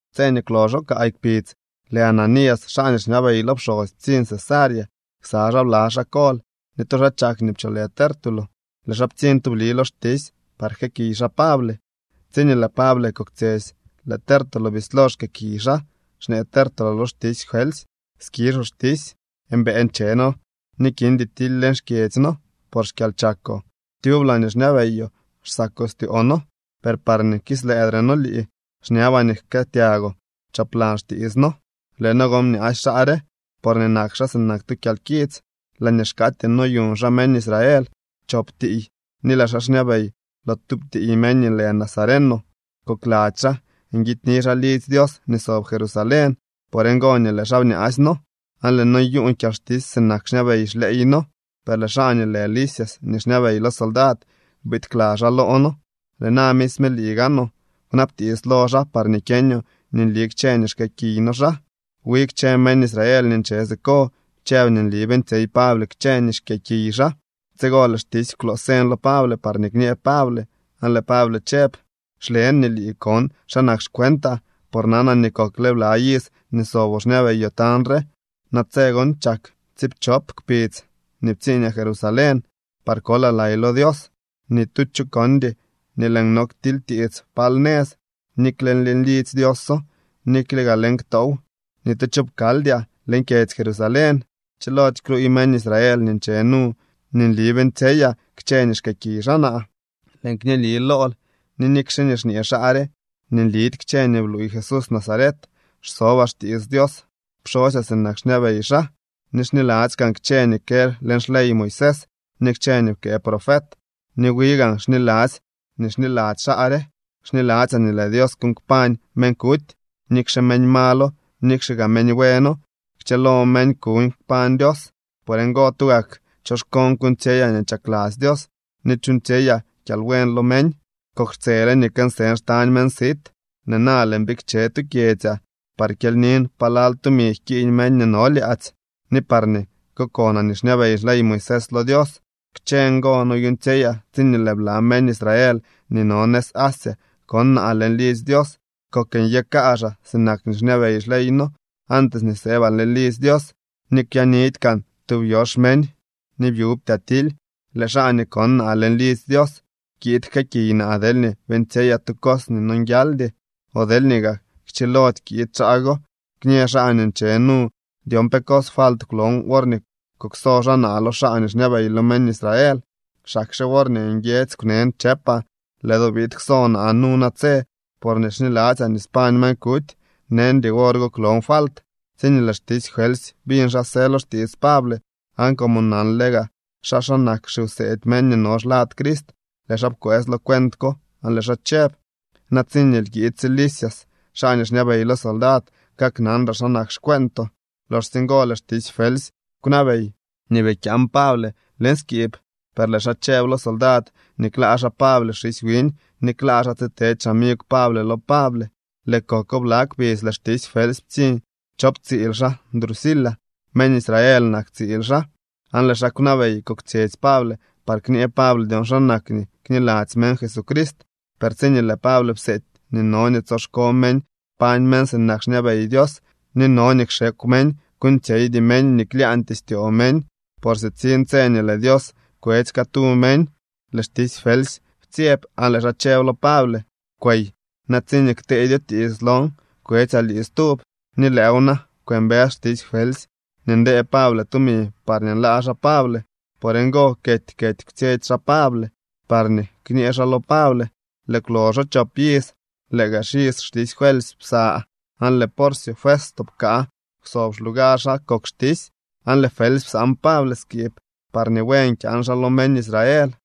Tse nii kwloxo kaay kpidz, lëë Ananías, xaa nii xñabey lo pxosy ptsiñ Cesarea ksa xaa bla xaa kol ni tu xaa chak nii pcholë Tértulo. Lëë xaa ptsiñ tubli lo xtisy par jkëëkiy xaa Pable. Tsiñee lëë Pable koktsyetsy, lëë Tértulo bislo xkëëkiy xaa, xñee Tértulo lo xtisy Felsy: —Skizhoo xtisy, mbëë nche noo ni kindy tily leñ xkyedzy noo por xkyalchakoo. Tyub laañee xñabeyoo xsako styoo noo. Per parñee kislëëdre noo lii, xñabaa nii jkëëtyagoo choplan xtiits noo. Lëë noo gon bñaasy xaa re porñee nak xaa sinak tu kyalkits. Laañee xkaatyee noyuñ xaa meñ Israel chop tiiy ni lëë xaa xñabey lo tub tiiy meñ nii lë Nazareno. Kokladzy xaa nguidyni xaa lidzy Dios nii sob Jerusalén. Por ngo nii lëë xaa bñaasy noo aan lëë noo nyuuñ kyalxtisy sinak xñabey xleey noo, per lëë xaa nii lë Lisias nii xñabey lo soldad biid kla xaa loo noo. Lëë na misme lii gaanoo, kwnabtiits lo xaa parñee kyeñoo nii nli kchë nii xkëëkiy noo xaa. Wi kchë meñ Israel nii nche siko chëb nii nli beeñtsyey Pable kchë nii xkyëëkiy xaa. Tsigo lëë xtisy kwloo señ lo Pable parñee kñee Pable, aan lëë Pable chëb: —Xlen nii lii kon xa nak xcuentaa por nanaa nii kokle bla iz nii soboo xñabeyoo tañ re. Natse gon chak tsiipchop kpidz nii ptsiiñaa Jerusalén par kolaa lay lo Dios. Ni tu cho kondy nii lëën no ktilytiits pal nëz, nikle leñ lidzy Dioso, nikle gaa leñ ktoow. Ni tu cho pkaldyaa leñ kyedzy Jerusalén. Chilody kluuy meñ Israel nii nche nu nii nli beeñtsyeyaa kchë nii xkëëkiy xaa naa. Lëën kñëëli lool nii nikxe nii xñee xaa re nii nlidy kchë nii bluuy Jesús Nazaret, xsobaa xtiits xDios pxosyaa sinak xñabey xaa. Ni xniladzy kaan kchë nii kë leñ xley Moisés ni kchë nii pkëë profet. Ni wi gaan xniladzy nii xniladzy xaa re. Xniladzyaa nii lëë Dios kuuñ kpañ meñ kuty. Nikxe meñ malo, nikxe gaa meñ bueno, kchëlo meñ kuuñ kpañ Dios. Por ngo, tugak choxkoon kuuñtsyeyaa nii chakladzy Dios ni chuuñtsyeyaa kyalbuen lo meñ. ’Kok xtsele nii kënsën xtañ meñ sit. Lëë na lëën bikche tu kyedzyaa par kyelynin palal tumi jkiiñ meñ nii no lyaadzy ni parñee kokonaa nii xñabey xley Moisés lo Dios. Kchë ngo noyuuñtsyeyaa tsiñee lëë bla meñ Israel nii no nëz Asia kon naa leñ lidzy Dios. Kok nyë kaazhaa sinak nii xñabey xleey noo antes nii sëbaa leñ lidzy Dios, ni kwyaanidy kaan tub yox meñ, ni byubtyaa tily. Lëë xaa nii kon naa leñ lidzy Dios kiid jkëëkiy naa deelñee beeñtsyeyaa tu cos nii nonguialdy. O deelñee gaa kchilody kiid xaa go, kñë xaa nii nche nu dyon pe cos falt kwlon worñee kukso xaa naa lo xaa nii xñabey lo meñ Israel. Xakxe worñee nguiedzy kwnen chëpaa: “Lëë do biid kso naa nu natse porñee xniladzyaa nii spañ meñ kuty”, neñdy wor go kwlon falt. Tsiñee lëë xtisy Felsy biñ xa së lo xtiits Pable, aan como nanle gaa xaa xa nak xiwseedy meñ nii no xlad Crist, lëë xaa pkwëës lo cuent ko, aan lëë xaa chëb: —Na tsiñee kiidsye Lisias, xaa nii xñabey lo soldad, kaknanraa xa nak xcueentoo. Loxsye ngo lëë xtisy Felsy kwnabey nii bii kyaan Pable leñ skiib, per lëë xaa chëb lo soldad nii klaa xaa Pable xisy wiñ ni klaa xaa tsitedy xamigw Pable lo Pable. Lëë koko bla kpidz lëë xtisy Felsy ptsiñ chop tsiil xaa Drusila. Meñ Israel nak tsiil xaa. Aan lëë xaa kwnabey koktsyetsy Pable par kñee Pable dyon xa nak nii kniladzy meñ Jesucrist. Per tsiñee lëë Pable pseedy nii no nii tsoxko meñ kpañ meñ sinak nii xñabey Dios, ni no nii kxekw meñ kuuñtsyeydy meñ nii klyaañtyee styoo meñ por sitsiñ tse nii lëë Dios kwetsy catu meñ, lëë xtisy Felsy ptsyeb aan lëë xaa chëb lo Pable: —Kwey. Na tsiñee kteedyoo tiits lon, kwetsyaa lii stub. Ni lëëw na kwëmbës xtisy Felsy nii ndee Pable tumi parñee nlaa xaa Pable. Por ngo kety kety kwtsyetsy xaa Pable parñee kñee xaa lo Pable. Lëë kwloxo chop iz, lëë gaa xiz xtisy Felsy psa, aan lëë Porcio Festo pkaa kwsob xlugar xaa kok xtisy. Aan lëë Felsy psaan Pable skiib parñee buen kyaan xaa lo meñ Israel.